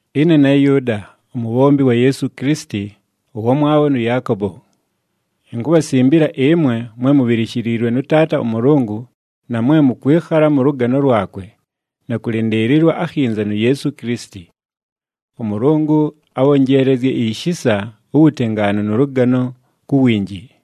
Ɨne ne Yʉʉda, umubhombi wa Yeesu Kilisiti, ʉwamwabho nʉ Yaakobo. Inkubhasimbila ɨmwe mwe mubhilishiliilwe nʉ Taata ʉMʉlʉngʉ na mwe mʉkwɨkhala mʉ lʉgano lwakwe, na kʉlɨndɨɨlɨlwa akhinza nu Yeesu Kilisiti. ɄMʉlʉngʉ abhonjeelezye ishisa, uwutengaanu nʉ lʉgano ku winji.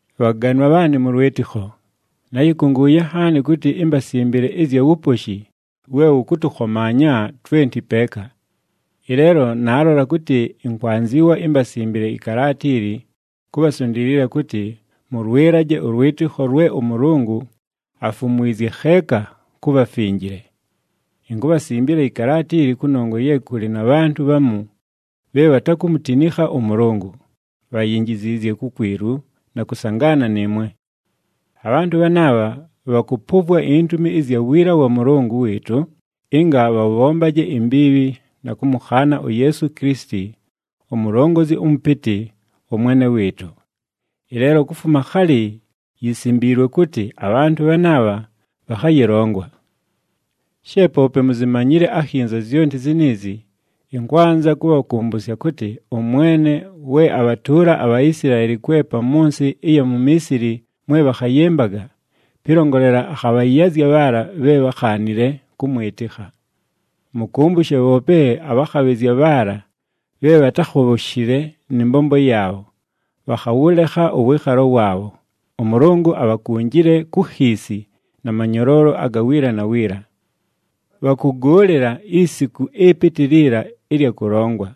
Bhaganwa bhaanɨ mʉ lwɨtɨkho, náyɨkʉngʉʉye nhaani kʉtɨ imbasimbile ɨzya wuposhi we wʉkʉtʉkhomaanya twenti peeka. Ɨleelo naalola kʉtɨ ɨnkwanzɨwa imbasimbile ɨkalaata ili kubhasundiilila kʉtɨ mʉlwɨlaje ʉlwɨtɨkho lwe ʉMʉlʉngʉ afumwizye kheeka ku bhafinjile. Inkubhasimbila ɨkalaata ili kʉnongwa ye kʉlɨ na bhantʉ bhamu bhe bhatakumutinikha ʉMʉlʉngʉ, bhayinjiziizye kukwilu na kʉsangaana nɨɨmwe. Abhantʉ bhanaabha bhakʉpʉvwa intumi ɨzya wiila wa Mʉlʉngʉ wɨɨtʉ ɨnga bhabhombaje imbiibhi na kʉmʉkhaana uYeesu Kilisiti, uMulongozi ʉMʉpɨtɨ, ʉMwene wɨɨtʉ. Ɨleelo kufuma khalɨ yisimbiilwe kʉtɨ abhantʉ bhanaabha bhakhayɨlongwa. She poope muzimanyile akhinza zyonti ziniizi, ɨnkwanza kʉbhakʉmbʉsya kʉtɨ ʉMwene we abhatʉʉla aBhaisilaeli kwepa mʉ nsɨ ɨya mu Miisili mwe bhakhayɨmbaga, pɨlongolela akhabhayazya bhaala bhe bhákhaanile kʉmwɨtɨkha. Mʉkʉmbʉshe, bhoope abhakhabhɨzya bhaala bhe bhatákhobhoshile nɨ mbombo yaabho, bhakhawʉlekha ʉwɨɨkhalo waabho, ʉMʉlʉngʉ abhakunjile ku khiisi na manyoloolo aga wiila na wiila. Bhakʉgʉʉlɨla isiku ɨpɨtɨ liila ɨlya kʉlongwa.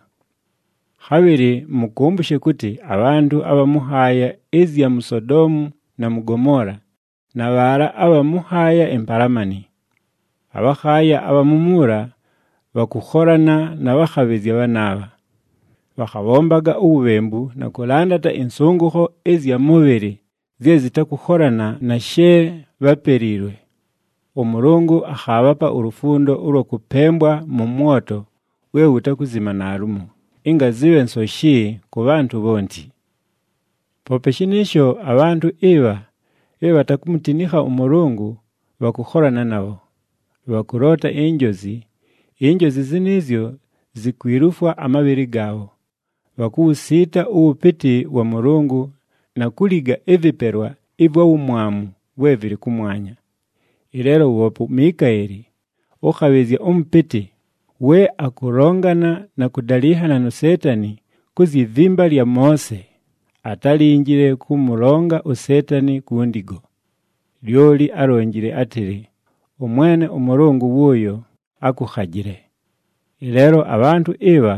Khabhɨlɨ mʉkʉmbʉshe kʉtɨ abhantʉ abha mʉ nhaaya ɨzya mu Sodoomu na mʉ Gomoola, na bhaala abha mʉ nhaaya impalamani. Abhakhaaya abha mumuula bhakʉkholana na bhakhabhɨzya bhanaabha. Bhakhabhombaga uwubhembu na kʉlandata ɨnsʉngʉkho ɨzya mʉbhɨlɨ zye zɨtakʉkholana na she bhápeliilwe. ɄMʉlʉngʉ akhaabhapa ulufundo ʉlwa kʉpembwa mʉ mwoto we wutakuzima naalumo, ɨnga zɨbhe nsoshi kʉ bhantʉ bhonti. Poope shɨnɨɨsho abhantʉ ɨbha bhe bhatakumutinikha ʉMʉlʉngʉ bhakʉkholana nabho. Bhakʉloota injozi, injozi zɨnɨɨzyo zikwilufwa amabhɨlɨ gaabho, bhakuwusiita ʉwʉpɨtɨ wa Mʉlʉngʉ na kuliga ɨvɨpelwa ɨvwa wumwamu vwe vɨlɨ kʉmwanya. Ɨleelo woope uMikaeli, ʉkhabhɨzya ʉmʉpɨtɨ, we akʉlongana na kʉdalɨnhana nu Seetani ku zyi vimba lya Moose, atálinjile kʉmʉlonga uSeetani ku ndigo. Lyoli álonjile átɨlɨ, “ɄMwene ʉMʉlʉngʉ wʉʉyo akʉkhajɨle!” Ɨleelo abhantʉ ɨbha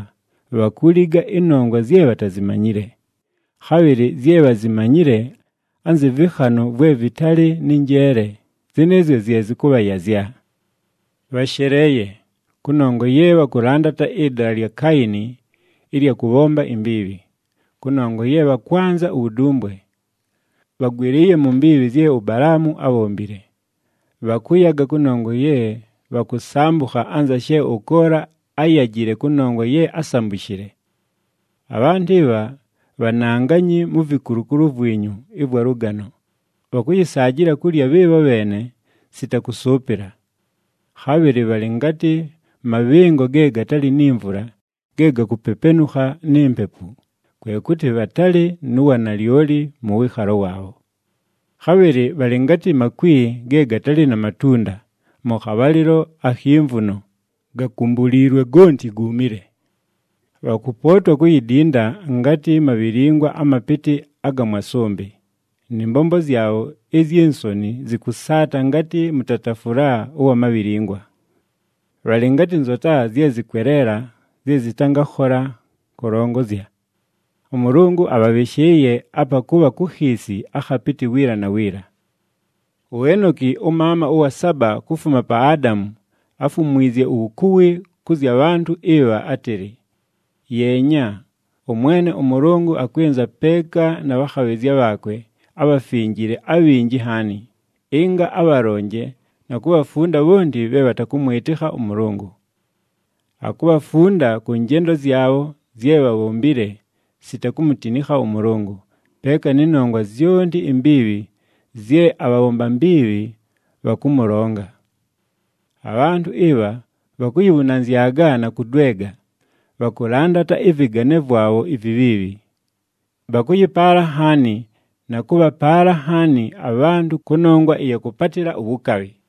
bhakuliga ɨnongwa zye bhatazimanyile. Khabhɨlɨ zye bhazimanyile anzɨ vɨkhanʉ vwe vɨtalɨ nɨ njeele, zɨnɨɨzyo zye zɨkʉbhayazya. Bhasheleeye! Kʉnongwa ye bhakʉlandata ɨdala lya Kaayini ɨlya kʉbhomba imbiibhi. Kʉnongwa ye bhakwanza uwudumbwe, bhagwɨlɨɨye mu mbiibhi zye uBalaamu ábhombile. Bhakʉyaga kʉnongwa ye bhakʉsambʉkha anza she ʉKoola áyajile kʉnongwa ye ásambushile. Abhantʉ ɨbha bhananganyi mu vikulukulu vwinyu ɨvwa lʉgano, bhakʉyɨsaajɨla kulya bhɨɨbho bheene sita kʉsʉʉpɨla. Khabhɨlɨ bhalɨ ngatɨ mabhɨngo ge gatalɨ ni mvula ge gakupepenukha ni mpepu, kwe kʉtɨ bhatalɨ nu wanalyoli mʉ wɨɨkhalo waabho. Khabhɨlɨ bhalɨ ngatɨ makwi ge gatalɨ na matunda mʉ khabhalɨlo akhi mvuno, gakumbuliilwe gonti guumile. Bhakʉpootwa kuyidinda ngatɨ mabhilingwa amapɨtɨ aga mwa sʉmbɨ, nɨ mbombo zyabho izyi nsoni zɨkʉsaata ngatɨ mʉtatafʉla ʉwa mabhilingwa. Bhalɨ ngatɨ nzota zye zɨkweleela zye zɨtangakhola kʉlongozya. ɄMʉlʉngʉ abhabhɨshɨɨye apa kʉbha ku khiisi akhapɨtɨ wiila na wiila. UEnoki, ʉmaama ʉwa saba kufuma pa Adamu áfumwizye uwukuwi kʉ zya bhantʉ ɨbha átɨlɨ, “Yeenya, ʉMwene ʉMʉlʉngʉ akwɨnza peeka na bhakhabhɨzya bhaakwe abhafinjile abhinji nhaani, ɨnga abhalonje na kubhafunda bhonti bhe bhatakʉmwɨtɨkha ʉMʉlʉngʉ. Akubhafunda kʉ njendo zyabho zye bhabhombile sita kumutinikha ʉMʉlʉngʉ, peeka nɨ nongwa zyonti imbiibhi zye abhabhomba mbiibhi bhakʉmʉlonga.” Abhantʉ ɨbha bhakuyibhunanzyaga na kʉdwega, bhakʉlandata ɨvɨgane vwabho ivibhiibhi. Bhakʉyɨpaala nhaani na kʉbhapaala nhaani abhantʉ kʉnongwa ɨya kʉpatɨla uwukabhi.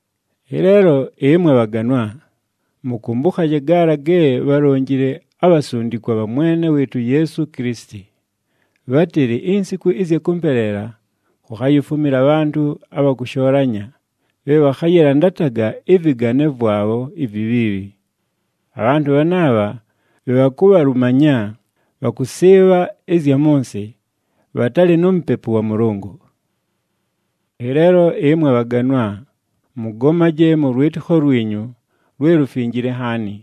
Ɨleelo ɨmwe bhaganwa, mʉkʉmbʉkhaje gaala ge bhálonjile abhasundikwa bha Mwene wɨɨtʉ uYeesu Kilisiti. Bhátɨlɨ, “Insiku ɨzya kʉmpeleela kukhayifumila abhantʉ abha kʉshoolanya, bhe bhakhayɨlandataga ɨvɨgane vwabho ivibhiibhi.” Abhantʉ bhanaabha bhe bhakubhalumanya, bhakʉsɨɨbha ɨzya mʉ nsɨ, bhatalɨ nu Mupepu wa Mʉlʉngʉ. Ɨleelo ɨmwe bhaganwa, mʉgomaje mʉ lwɨtɨkho lwinyu lwe lufinjile nhaani,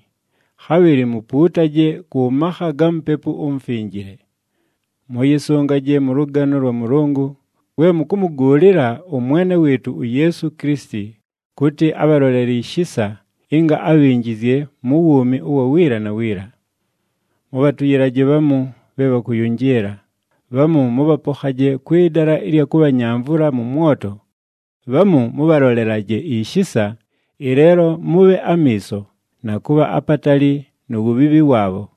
khabhɨlɨ mupuutaje kʉ makha ga Mupepu uMufinjile. Mʉyɨsʉngaje mʉ lʉgano lwa Mʉlʉngʉ, we mʉkʉmʉgʉʉlɨla ʉMwene wɨɨtʉ uYeesu Kilisiti kʉtɨ abhalolele ishisa ɨnga abhinjizye mu wuumi ʉwa wiila na wiila. Mʉbhatʉyɨlaje bhamu bhe bhakʉyʉnjɨɨla, bhamu mʉbhapokhaje kwɨ dala ɨlya kʉbhanyamvʉla mʉ mwoto, bhamu mʉbhalolelaje ishisa, ɨleelo mʉbhe amiiso, na kʉbha apatali nu wubhiibhi waabho.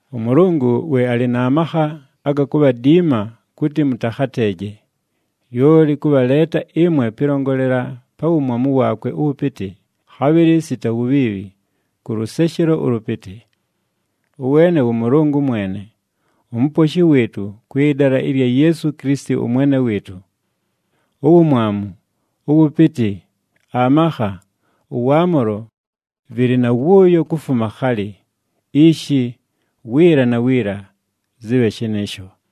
ɄMʉlʉngʉ we alɨ na makha aga kubhadiima kʉtɨ mʉtakhateeje, lyoli kʉbhaleeta ɨmwe pɨlongolela pa wumwamu waakwe ʉwʉpɨtɨ, khabhɨlɨ sita wubhiibhi, kʉ lʉseshelo ʉlʉpɨtɨ. Ʉweene wʉ Mʉlʉngʉ mwene, uMuposhi wɨɨtʉ kwɨ dala ɨlya Yeesu Kilisiti ʉMwene wɨɨtʉ. Uwumwamu, ʉwʉpɨtɨ, amakha, ʉwaamʉlo vɨlɨ na wʉʉyo kufuma khalɨ, ishi, wiila na wiila. Zɨbhe shɨnɨɨsho.